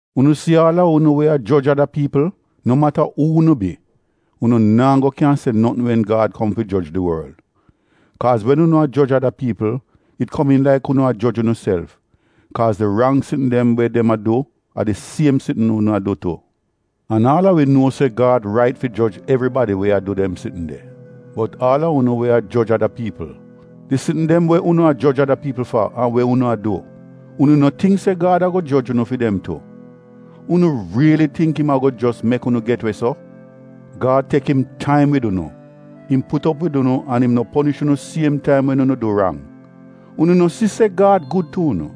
Unu si aal a unu we a joj ada piipl, no mata uu unu bi, unu naa go kyan se notn wen Gad kom fi joj di worl. Kaaz wen unu a joj ada piipl, it komiin laik unu a joj unuself, kaaz di rang sitn dem we dem a du, a di siem sitn unu a du tu. An aal a wi nuo se Gad rait fi joj evribadi we a du dem sitn de. Bot aal a unu we a joj ada piipl, di sitn dem we unu a joj ada piipl fa an we unu a du, unu no tingk se Gad ago joj unu fi dem tu? Unu riili tingk im ago jos mek unu get we so? Gad tek im taim wid unu, im put op wid unu an im no ponish unu siem taim wen unu du rang. Unu no si se Gad gud tu unu?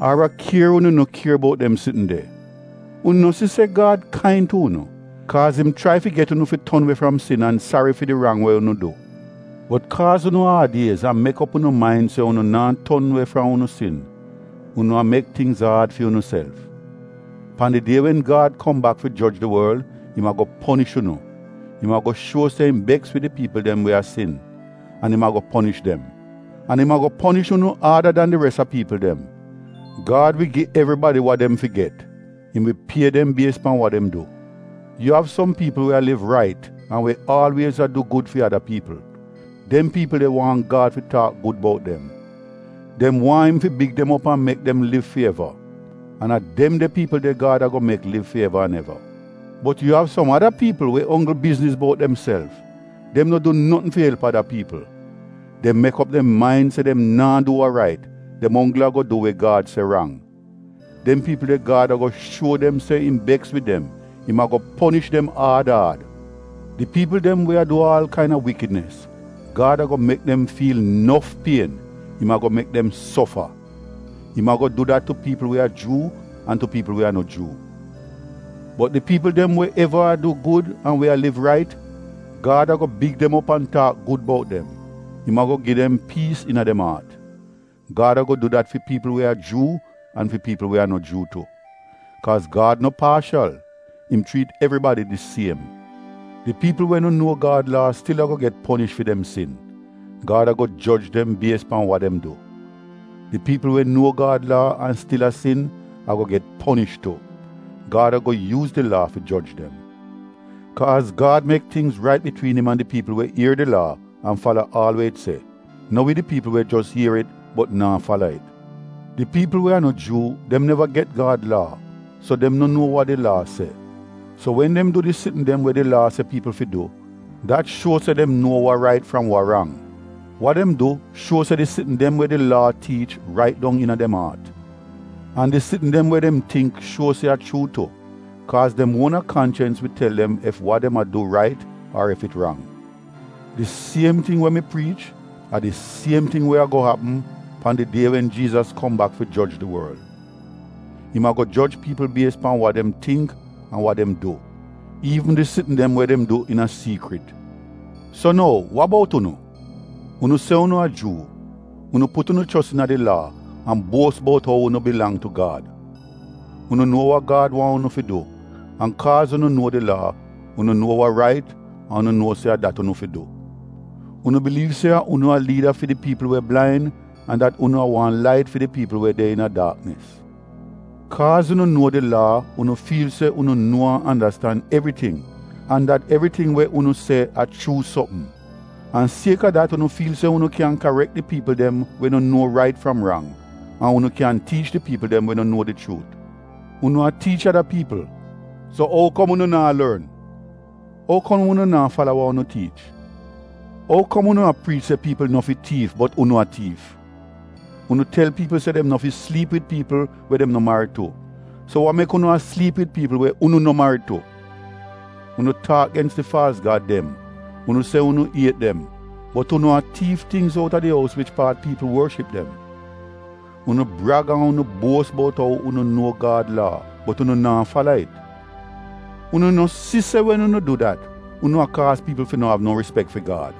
Ar a kier unu no kier bout dem sitn de? Unu no si se Gad kain tu unu, kaaz im chrai fi get unu fi ton we fram sin an sari fi di rang we unu du? Bot kaaz unu aad-iez an mek op unu main se unu naa ton we fram unu sin — unu a mek tingz aad fi unuself. Pan di die wen Gad kom bak fi joj di worl, im ago ponish unu. Im ago shuo se im beks wid di piipl dem we a sin, an im ago ponish dem. An im ago ponish unu aada dan di res a piipl dem. Gad “wi gi evribadi wa dem fi get — im wi pie dem bies pan wa dem du.” Yu av som piipl we a liv rait an we aalwiez a du gud fi ada piipl. Dem piipl de waahn Gad fi taak gud bout dem. Dem waahn im fi big dem op an mek dem liv fi eva. An a dem de piipl de Gad ago mek liv fi eva an eva. Bot yu av som ada piipl we onggl bizniz bout demself — dem no du notn fi elp ada piipl. Dem mek op dem main se dem naa du wa rait — dem onggl ago du we Gad se rang. Dem piipl de Gad ago shuo dem se im beks wid dem, im ago ponish dem aad aad. Di piipl dem we a du aal kaina wikidnis, Gad ago mek dem fiil nof pien — im ago mek dem sofa. Im ago du dat tu piipl we a Juu an tu piipl we a no Juu. Bot di piipl dem we eva a du gud an we a liv rait, Gad ago big dem op an taak gud bout dem. Im ago gi dem piis iina dem aat. Gad ago du dat fi piipl we a Juu an fi piipl we a no Juu tu. Kaaz Gad no paashal, im chriit evribadi di siem. Di piipl we no nuo Gad Laa stil ago get ponish fi dem sin. Gad ago joj dem bies pan wa dem du. Di piipl we nuo Gad Laa an stil a sin, ago get ponish tu. Gad ago yuuz di Laa fi joj dem. Kaaz Gad mek tingz rait bitwiin im an di piipl we ier di Laa an fala aal we it se, no wid di piipl dem we jos ier it bot naa fala it. Di piipl we a no Juu, dem neva get Gad Laa, so dem no nuo wa di Laa se. So wen dem du di sitn dem we di Laa se piipl fi du, dat shuo se dem nuo wa rait fram wa rang. Wa dem du shuo se di sitn dem we di Laa tiich rait dong iina dem aat. An di sitn dem we dem tingk, shuo se a chuu tu. Kaaz dem uona kanchens wi tel dem ef wa dem a du rait ar ef it rang. Di siem ting we mi priich a di siem ting we ago apm pan di die wen Jiizas kom bak fi joj di worl. Im ago joj piipl bies pan wa dem tingk an wa dem du, iivn di sitn dem we dem du iina siikrit. So nou, wa bout unu? Unu se unu a Juu, unu put unu chos iina di Laa an buos bout ou unu bilang tu Gad. Unu nuo wa Gad waahn unu fi du an kaaz unu nuo di Laa, unu nuo wa rait an unu nuo se a dat unu fi du. Unu biliiv se a unu a liida fi di piipl we blain an dat unu a wan lait fi di piipl we de iina daaknis. Kaaz unu nuo di Laa unu fiil se unu nuo an andastan evriting an dat evriting we unu se a chuu sopm. An sieka dat unu fiil se unu kyan karek di piipl dem we no nuo rait fram rang an unu kyan tiich di piipl dem we no nuo di chuut. Unu a tiich ada piipl, so ou kom unu naa lorn? Ou kom unu naa fala wa unu tiich? Ou kom unu a priich se piipl no fi tiif bot unu a tiif? Unu tel piipl se dem no fi sliip wid piipl we dem no marid tu, so wa mek unu a sliip wid piipl we unu no marid tu? Unu taak gens di faalz gad dem, unu se unu iet dem, bot unu a tiif tingz outa di ous wich paat piipl worship dem. Unu brag an unu buos bout ou unu nuo Gad Laa bot unu naa fala it. Unu no si se wen unu du dat unu a kaaz piipl fi no av no rispek fi Gad?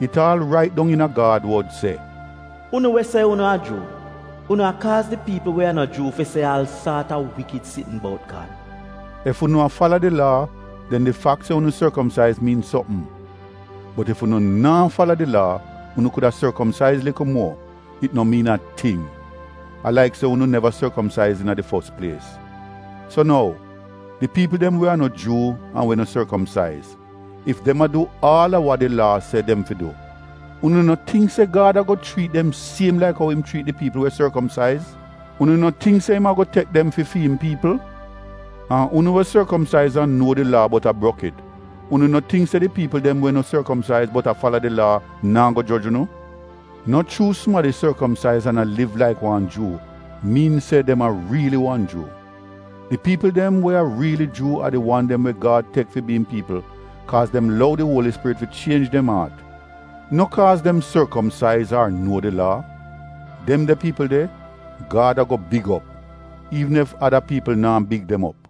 It aal rait dong iina Gad wod se, “Unu we se unu a Juu, unu a kaaz di piipl we a no Juu fi se aal saat a wikid sitn bout Gad.” Ef unu a fala di Laa, den di fak se unu sorkomsaiz miin sopm. Bot ef unu naa fala di Laa, unu kuda sorkomsaiz likl muor, it no miin a ting — a laik se unu neva sorkomsaiz iina di fos plies. So nou, di piipl dem we a no Juu an we no sorkomsaiz, ef dem a du aal a wa di Laa se dem fi du, unu no tingk se Gad ago chriit dem siem laik ou im chriit di piipl we sorkomsaiz? Unu no tingk se im ago tek dem fi fi im piipl? An unu we sorkomsaiz an nuo di Laa bot a brok it, unu no tingk se di piipl dem we no sorkomsaiz bot a fala di Laa naa go joj unu? No chuu sumadi sorkomsaiz an a liv laik wan Juu miin se dem a riili wan Juu. Di piipl dem we a riili Juu a di wan dem we Gad tek fi bi im piipl kaaz dem lou di Uoli Spirit fi chienj dem aat, no kaaz dem sorkomsaiz ar nuo di Laa. Dem de piipl de, Gad ago big op, iivn ef ada piipl naa big dem op.